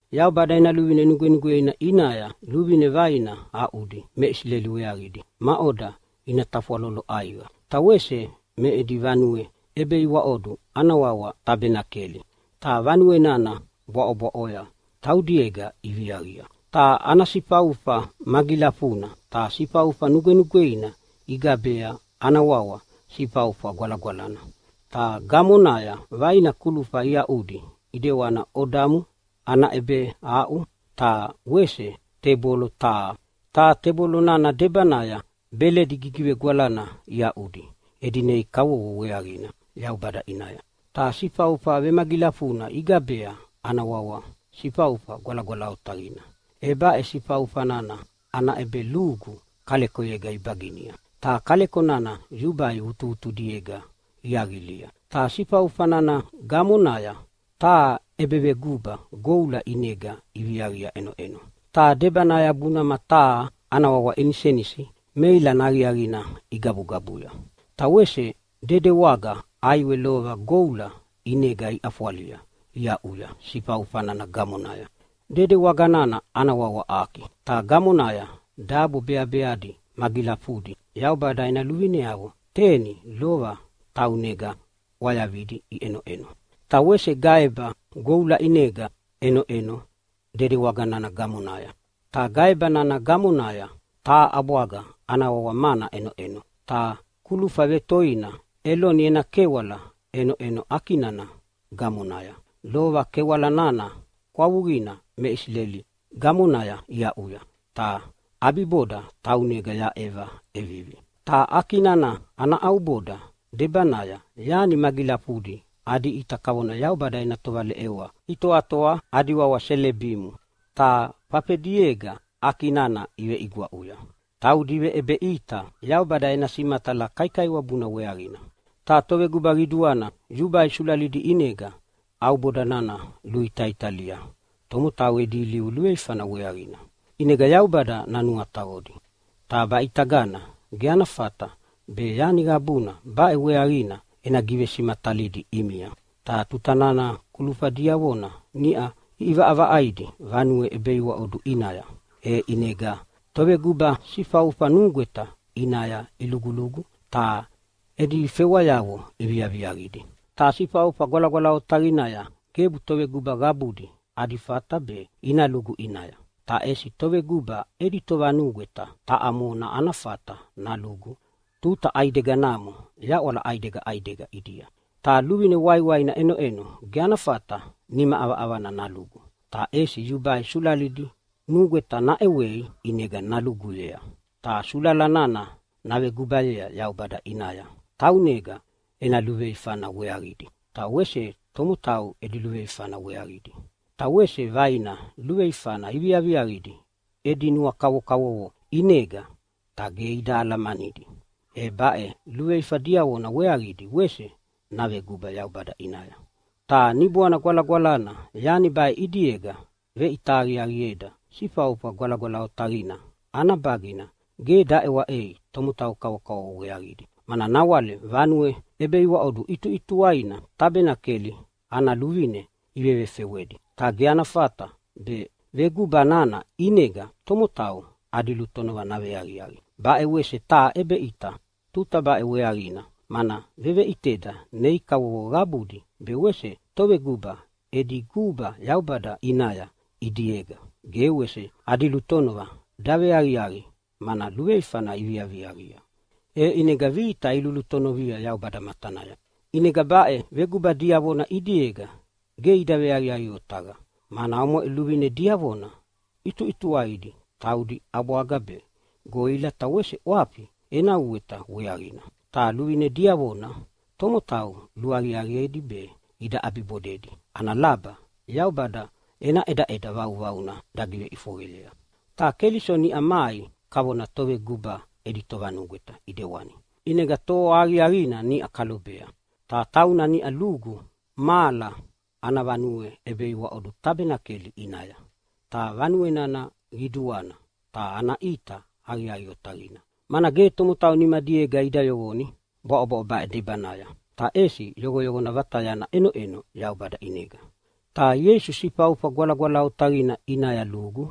Yaubada ena luvine nugwenugweina ʼinaya luvine vaina aʼudi me Isileli weaqidi maʼoda ina tafwalolo ʼaiqa. Ta wese me edi vanue ʼebeiwaʼodu ana wawa Tabenakeli, ta vanue nana bwaʼobwaʼoya taudiega iviaqia. Ta ana sifaufa magilafuna. Ta sifaufa nugwenugweina igabea ana wawa Sifaufa Gwalagwalana. Ta gamonaya vaina kulufa iaʼudi ʼidewani odamu ana ʼebeaʼu ta wese tebolo taha. Ta tebolo nana debanaya beledi gigivegwalana iaʼudi edi nei kavovo weaqina Yaubada ʼinaya. Ta sifaufa vemagilafuna igabea ana wawa Sifaufa Gwalagwala Otaqina. E baʼe sifaufa nana ana ʼebelugu kalekoyega ibaginia, ta kaleko nana yubai vutuvutudiega iaqilia. Ta sifaufa nana gamonaya taha ʼebeveguba goula ʼinega iviaqia ʼenoʼeno, ta debanaya bunama taha ana wawa inisenisi meilana aqiaqina igabugabuya. Ta wese dedewaga ʼaiwe lova goula ʼinega iʼafwalia iaʼuya sifaufa nana gamonaya. Dedewaga nana ana wawa Aki, ta gamonaya dabo beabeadi magilafudi Yaubada ena luvineavo teni lova taunega ʼwayavidi iʼenoʼeno. Ta wese gaeba goula ʼinega ʼenoʼeno dedewaga nana gamonaya, ta gaeba nana gamonaya taha ʼabwaga ana wawa mana ʼenoʼeno. Ta kulufa vetoina Eloni ena kewala ʼenoʼeno Aki nana gamonaya. Lova kewala nana kwavuqina me Isileli gamonaya iaʼuya, ta ʼabiboda taunega yaʼeva ʼevivi. Ta Aki nana ana ʼauboda debanaya yani magilafudi adi ʼita kavona Yaubada ena tovaleʼewa itoatoa adi wawa Selebimu, ta fafediega Aki nana iveʼigwaʼuya. Taudi iveʼebeʼita Yaubada ena simatala kaikaiwabuna weaqina. Ta toveguba qiduana yubai sulalidi ʼinega ʼauboda nana luitaitalia tomotau edi ilivu luveifana weaqina, ʼinega Yaubada nanuataqodi. Ta baʼitagana ge ana fata be yani qabuna baʼe weaqina ena givesimatalidi ʼimia. Ta tuta nana kulufa diavona niʼau iʼivaʼavaʼaidi vanue ʼebeiwaʼodu ʼinaya, e ʼinega toveguba sifaufa nugweta ʼinaya ilugulugu ta edi fewayavo iviaviaqidi. Ta Sifaufa Gwalagwala Otaqinaya gebu toveguba qabudi adi fata be ina lugu ʼinaya, ta ʼesi toveguba edi tovanugweta taʼa mona ana fata nalugu tuta ʼaideganamo yaʼwala ʼaidega ʼaidega ʼidia. Ta luvine waiwaina ʼenoʼeno, ge ana fata nima ʼavaʼavana nalugu, ta ʼesi yubai sulalidi nugweta naʼewei ʼinega naluguyea. Ta sulala nana navegubayea Yaubada ʼinaya taunega ena luveifana weaqidi, be wese tomotau edi luveifana weaqidi. Ta wese vaina luveifana iviaqidi edi nua kavokavovo ʼinega ta ge ida alamanidi, e baʼe luveifa diavona weaqidi wese naveguba Yaubada ʼinaya. Ta Niboana Gwalagwalana yani baʼe ʼidiega veʼita aqiaqieda Sifaufa Gwalagwala Otaqina ana bagina ge daʼewaʼei tomotau kavokavovo weaqidi, mana nawale vanue ʼebeiwaʼodu ʼituʼituwaina Tabenakeli ana luvine ivevefewedi. Ta ge ana fata be veguba nana ʼinega tomotau adi lutonova naveaqiaqi. Baʼe wese taha ʼebeʼita tuta baʼe weaqina, mana veveʼiteda nei kavovo qabudi be wese toveguba edi guba Yaubada ʼinaya ʼidiega ge wese adi lutonova daveaqiaqi, mana luveifana iviaqia, e ʼinega vita ilulutonovia Yaubada matanaya. ʼInega baʼe veguba diavona ʼidiega ge ida veaqiaqi otaqa, mana omoʼe luvine diavona ʼituʼituwaidi taudi ʼabwaga be goʼila ta wese ʼwafi ena uweta weaqina. Ta luvine diavona tomotau luaqiaqiedi be ida ʼabibodedi ana laba Yaubada ena ʼedaʼeda vauvauna dagiveʼifoqeyea. Ta Keliso niʼa mai kavona Toveguba edi Tovanugweta ʼidewani, ʼinega toa aqiaqina niʼa kalobea. Ta tauna niʼa lugu mahala ana vanue ʼebeiwaʼodu Tabenakeli ʼinaya, ta vanue nana qiduana ta ana ʼita aqiaqi otaqina, mana ge tomotau nimadiega ida yoqoni bwaʼobwaʼo baʼe debanaya. Ta ʼesi yoqoyoqona vatayana ʼenoʼeno Yaubada ʼinega. Ta Ieisu Sifaufa Gwalagwala Otaqina ʼinaya lugu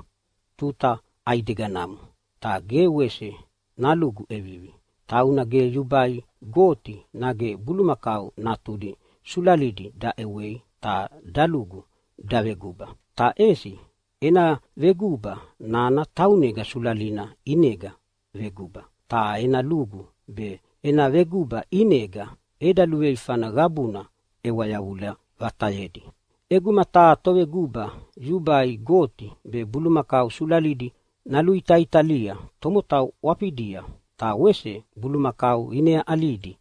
tuta ʼaideganamo, ta ge wese nalugu ʼevivi. Tauna ge yubai goti nage bulumakau natudi sulalidi daʼewei ta dalugu daveguba, ta ʼesi ena veguba nana taunega sulalina ʼinega veguba. Ta ena lugu be ena veguba ʼinega eda luveifana qabuna ʼewa yavula vatayedi. ʼEguma taha toveguba yubai goti be bulumakau sulalidi naluitaitalia tomotau ʼwafidia, ta wese bulumakau ineyaʼalidi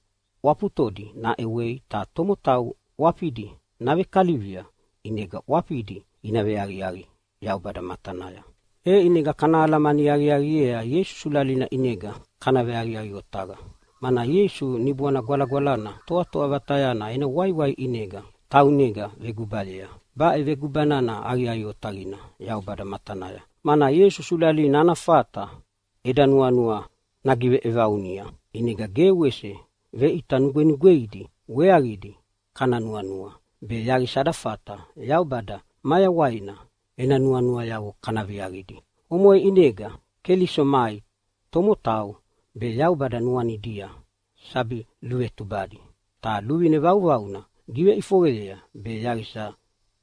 ʼwafutodi naʼewei ta tomotau ʼwafidi navekalivia ʼinega ʼwafidi ina veaqiaqi Yaubada matanaya, e ʼinega kana alamani aqiaqiea Ieisu sulalina ʼinega kana veaqiaqi otaqa, mana Ieisu Niboana Gwalagwalana Toatoa Vatayana ena waiwai ʼinega taunega vegubayea. Baʼe veguba nana aqiaqi otaqina Yaubada matanaya, mana Ieisu sulalina ana fata eda nuanua nagiveʼevaunia ʼinega ge wese veʼita nugwenugweidi weaqidi kana nuanua, be yaqisa ada fata Yaubada mayawaina ena nuanuayavo kana viaqidi. Omoʼe ʼinega Keliso mai tomotau be Yaubada nuanidia sabi luvetubadi, ta luvine vauvauna giveʼifoqeyea be yaqisa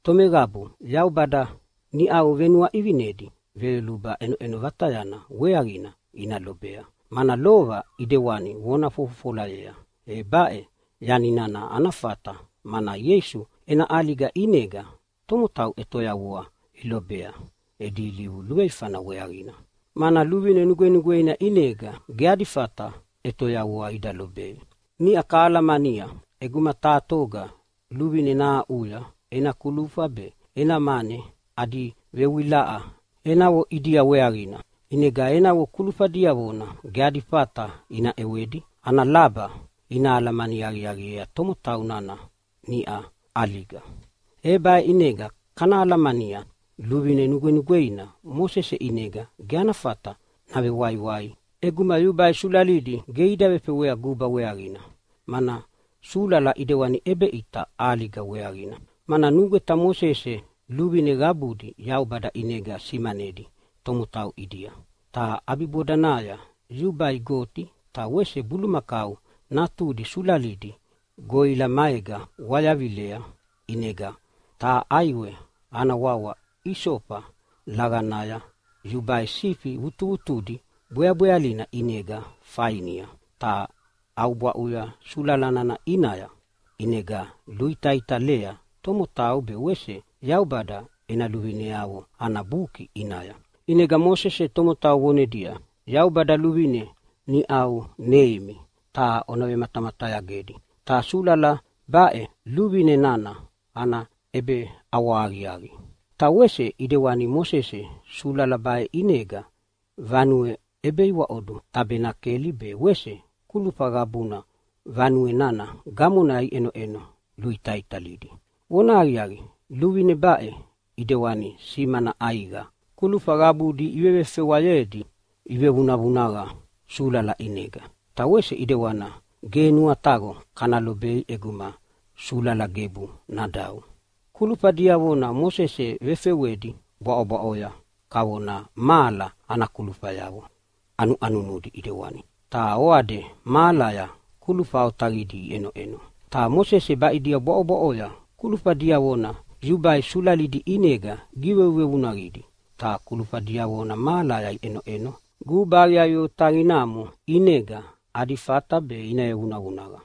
tomeqabu Yaubada niʼau venuaʼivinedi veyoluba ʼenoʼeno vatayana weaqina ina lobea, mana lova ʼidewani vona fofofolayea. E baʼe yani nana ana fata mana Ieisu ena ʼaliga ʼinega tomotau ʼetoyavua ilobea edi ilivu luveifana weaqina, mana luvine nugwenugweina ʼinega ge adi fata ʼetoyavua ida lobei. Niʼau kahalamania ʼeguma taha toga luvine nahaʼuya ena kulufa be ena mane adi vewilaʼa enavo ʼidia weaqina, ʼinega enavo kulufa diavona ge adi fata ina ʼewedi ana laba ina alamani aqiaqiea tomotau nana niʼa ʼaliga. E baʼe ʼinega kana alamania luvine nugwenugweina Mosese ʼinega ge ana fata navewaiwai ʼeguma yubai sulalidi ge ida vefewea guba weaqina, mana sulala ʼidewani ʼebeʼita ʼaliga weaqina. Mana nugweta Mosese luvine qabudi Yaubada ʼinega simanedi tomotau ʼidia, ta ʼabibodanaya yubai goti ta wese bulumakau natudi sulalidi goʼila maega wayavilea. ʼInega taha ʼaiwe ana wawa isofa laqanaya yubai sifi vutuvutudi bweabwealina ʼinega fainia ta ʼaubwaʼuya sulala nana ʼinaya, ʼinega luitaitalea tomotau be wese Yaubada ena luvineavo ana buki ʼinaya. ʼInega Mosese tomotau vonedia, “Yaubada luvine niʼau neimi ta ona vematamatayagedi. Ta sulala baʼe luvine nana ana ʼebeʼawahaqiaqi.” Ta wese ʼidewani Mosese sulala baʼe ʼinega vanue ʼebeiwaʼodu Tabenakeli be wese kulufa qabuna vanue nana gamonaya iʼenoʼeno luitaitalidi. Vonahaqiaqi, luvine baʼe ʼidewani simana ʼaiqa: Kulufa qabudi ivevefewayedi ivevunavunaqa sulala ʼinega. Ta wese ʼidewana ge nuataqo kana lobei ʼeguma sulala gebu nadau. Kulufa diavona Mosese vefewedi bwaʼobwaʼoya kavona mahala ana kulufayavo ʼanuʼanunudi ʼidewani, ta oade mahalaya kulufa otaqidi iʼenoʼeno. Ta Mosese baʼidia bwaʼobwaʼoya kulufa diavona yubai sulalidi ʼinega givevunavunaqidi. Ta kulufa diavona mahalaya iʼenoʼeno guba aqiaqi otaqinamo ʼinega adi fata be ina vevunavunaqa.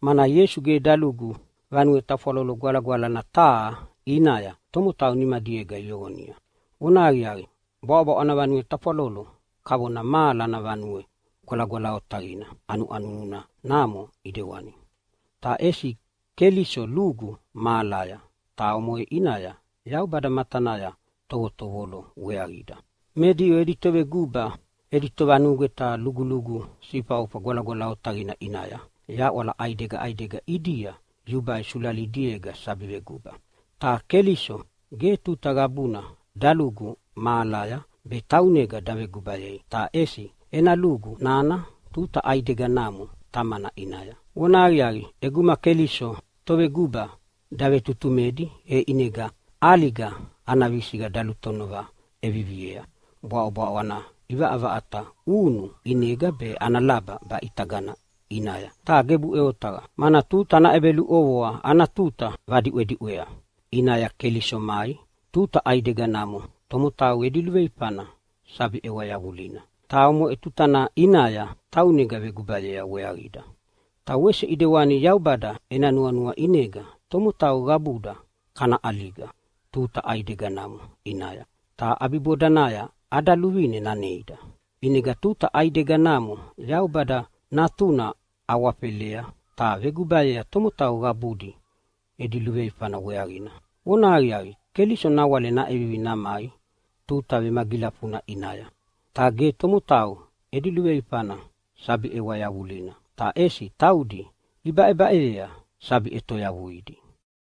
Mana Ieisu ge dalugu vanue tafwalolo gwalagwalana taha ʼinaya tomotau nimadiega iyoqonia. Vonahaqiaqi, bwaʼobwaʼo ana vanue tafwalolo kavona mahala ana Vanue Gwalagwala Otaqina ʼanuʼanunu namo ʼidewani. Ta ʼesi Keliso lugu mahalaya, ta omoʼe ʼinaya Yaubada matanaya tovotovolo weaqida. Me Diu edi toveguba edi tovanugweta lugulugu Sifaufa Gwalagwala Otaqina ʼinaya yaʼwala ʼaidega ʼaidega ʼidia yubai sulalidiega sabi veguba. Ta Keliso ge tuta qabuna dalugu mahalaya be taunega dagubayei, ta ʼesi ena lugu nana tuta ʼaideganamo Tamana ʼinaya. Vonahaqiaqi, ʼeguma Keliso toveguba davetutumedi e ʼinega ʼaliga ana visiqa dalutonova ʼeviviea bwaʼobwaʼo ana ʼivaʼavaʼata ʼunu ʼinega be ana laba baʼitaga ʼinaya. Ta gebuʼe otaqa, mana tuta ana ʼebeluʼovoa ana tuta vadiʼwediʼwea ʼinaya Keliso mai tuta ʼaideganamo tomotau edi luveifana sabi ʼewa yavulina, ta omoʼe tutana ʼinaya taunega gubayea weaqida. Ta wese ʼidewani Yaubada ena nuanua ʼinega tomotau qabuda kana ʼaliga tuta ʼaideganamo ʼinaya, ta ʼabibodanaya ada luvine naneida. ʼInega tuta ʼaideganamo Yaubada Natuna awafelea ta vegubayea tomotau qabudi edi luveifana weaqina. Vonahaqiaqi, Keliso nawale naʼevivi namai tuta vemagilafuna ʼinaya, ta ge tomotau edi luveifana sabi ʼewa yavulina, ta ʼesi taudi ibaʼebaʼeyea sabi ʼetoyavuidi.